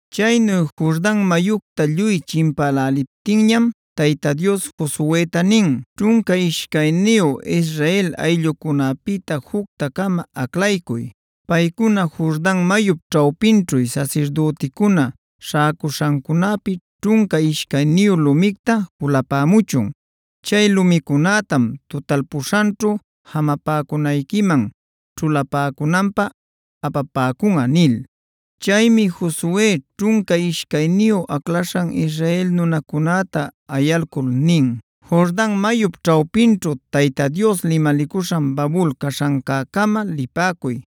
Chaynu Jordan mayucta lluy chimpäläliptinñam Tayta Dios Josueta nin: “Ćhunca ishcayniyu Israel ayllucunapïta jucta-cama aclaycuy. Paycuna Jordan mayup ćhawpinćhu sasirdüticuna śhäcuśhancunäpi ćhunca ishcayniyu lumicta julapämuchun. Chay lumicunätam tutalpuśhanćhu jamapäcunayquiman ćhulapäcunanpä apapäcunꞌa” nil. Chaymi Josue ćhunca ishcayniyu aclaśhan Israel nunacunäta ayalcul nin: “Jordan mayup ćhawpinćhu Tayta Dios limalicuśhan babul caśhancäcama lipäcuy.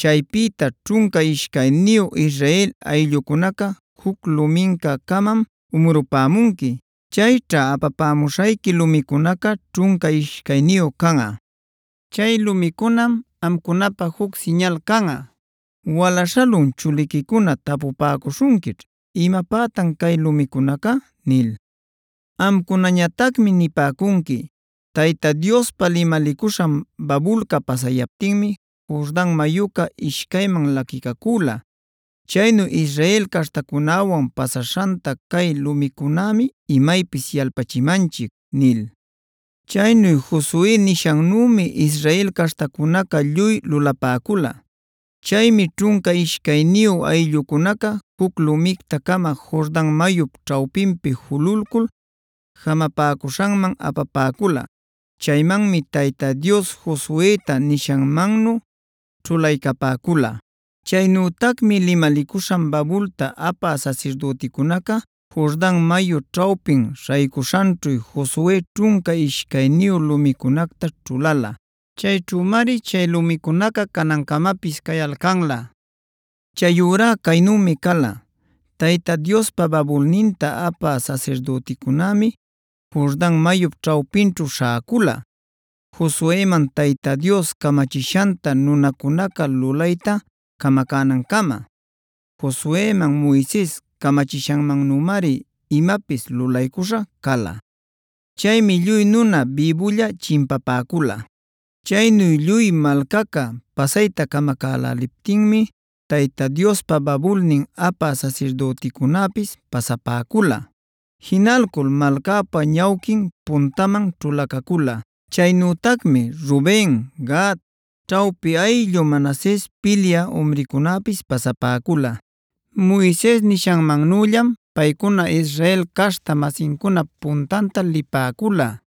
Chaypïta ćhunca ishcayniyu Israel ayllucunaca juc lumincä-camam umrupämunqui. Chayćha apamuśhayqui lumicunaca ćhunca ishcayniyu canꞌa. Chay lumicunam amcunapä juc siñal canꞌa. Wala-śhalun chuliquicuna tapupäcuśhunquićh: ‘¿Imapätan cay lumicunaca?’ nil. Amcunañatacmi nipäcunqui: ‘Tayta Diospa limalicuśhan babulca pasayaptinmi Jordan mayuca ishcayman laquicacüla. Chaynu Israel caśhtacunäwan pasaśhanta cay lumicunämi imaypis yalpachimanchic’” nil. Chaynu Josue nishanmannümi Israel caśhtacunaca lluy lulapäcula. Chaymi ćhunca ishcayniyu ayllucunaca juc lumicta-cama Jordan mayup ćhawpinpi jululcul jamapäcuśhanman apapäcula. Chaymanmi Tayta Dios Josueta nishanmannu ćhulaycapäcula. Chaynütacmi limalicuśhan babulta apä sasirdüticunaca Jordan mayu ćhawpin śhaycuśhanćhu Josue ćhunca ishcayniyu lumicunacta ćhulala. Chayćhümari chay lumicunaca canancamapis cayalcanlä. Chayurá caynümi cala: Tayta Diospa babulninta apä sasirdüticunämi Jordan mayup ćhawpinćhu śhäcula, Josueman Tayta Dios camachishanta nunacunaca lulayta camacänancama. Josueman Moises camachishanmannümari imapis lulaycuśha cala. Chaymi lluy nuna bïbulla chimpapäcula. Chaynu lluy malcaca pasayta camacäläliptinmi Tayta Diospa babulnin apä sasirdüticunäpis pasapäcula. Jinalcul malcäpa ñawquin puntaman ćhulacacula. Chaynütacmi Ruben, Gad, ćhawpi ayllu Manases pilyä umrincunäpis pasapäcula. Moises nishanmannüllam paycuna Israel caśhta-masincunap puntanta lipäcula.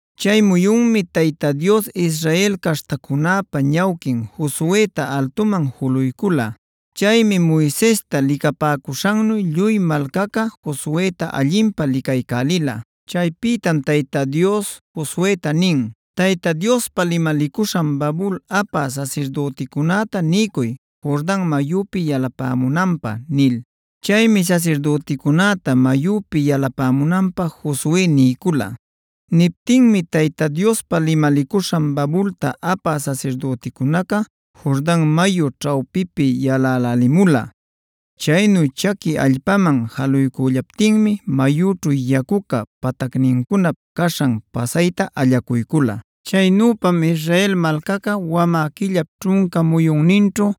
Chay muyunmi Tayta Dios Israel caśhtacunäpa ñawquin Josueta altuman juluycula. Chaymi Moisesta licapäcuśhannu lluy malcaca Josueta allinpä licaycälila. Chaypïtam Tayta Dios Josueta nin: “Tayta Diospa limalicuśhan babul apä sasirdüticunäta niycuy Jordan mayüpi yalapämunanpä” nil. Chaymi sasirdüticunäta mayüpi yalapämunanpä Josue niycula. Niptinmi Tayta Diospa limalicuśhan babulta apä sasirdüticunaca Jordan mayu ćhawpipi yalälälimula. Chaynu chaqui allpaman jaluycüllaptinmi mayüćhu yacuca patacnincunap caśhan pasayta allacuycula. Chaynüpam Israel malcaca wamä quillap ćhunca muyunninćhu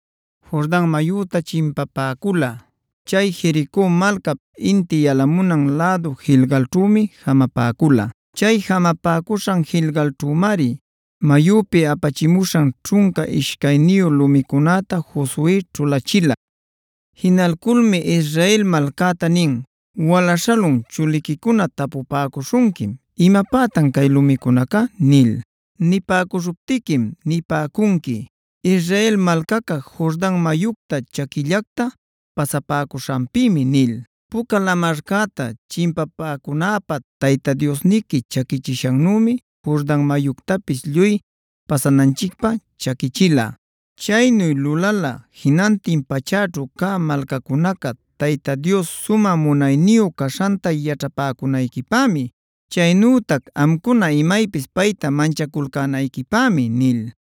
Jordan mayüta chimpapäcula. Chay Jerico malcap inti yalamunan lädu Gilgalćhümi jamapäcula. Chay jamapäcuśhan Gilgalćhümari mayüpi apachimuśhan ćhunca ishcayniyu lumicunäta Josue ćhulachila. Jinalculmi Israel malcäta nin: “Wala-śhalun chuliquicuna tapupäcuśhunquim: ‘¿Imapätan cay lumicunaca?’ nil. Nipäcuśhuptiquim nipäcunqui: ‘Israel malcaca Jordan mayucta chaquillacta pasapäcuśhanpïmi’ nil. Puca Lamarcäta chimpapäcunäpä Tayta Diosniqui chaquichishannümi Jordan mayuctapis lluy pasananchicpä chaquichila. Chaynu lulala jinantin pachäćhu cä malcacunaca Tayta Dios sumä munayniyu caśhanta yaćhapäcunayquipämi. Chaynütac amcuna imaypis payta manchaculcänayquipämi” nil.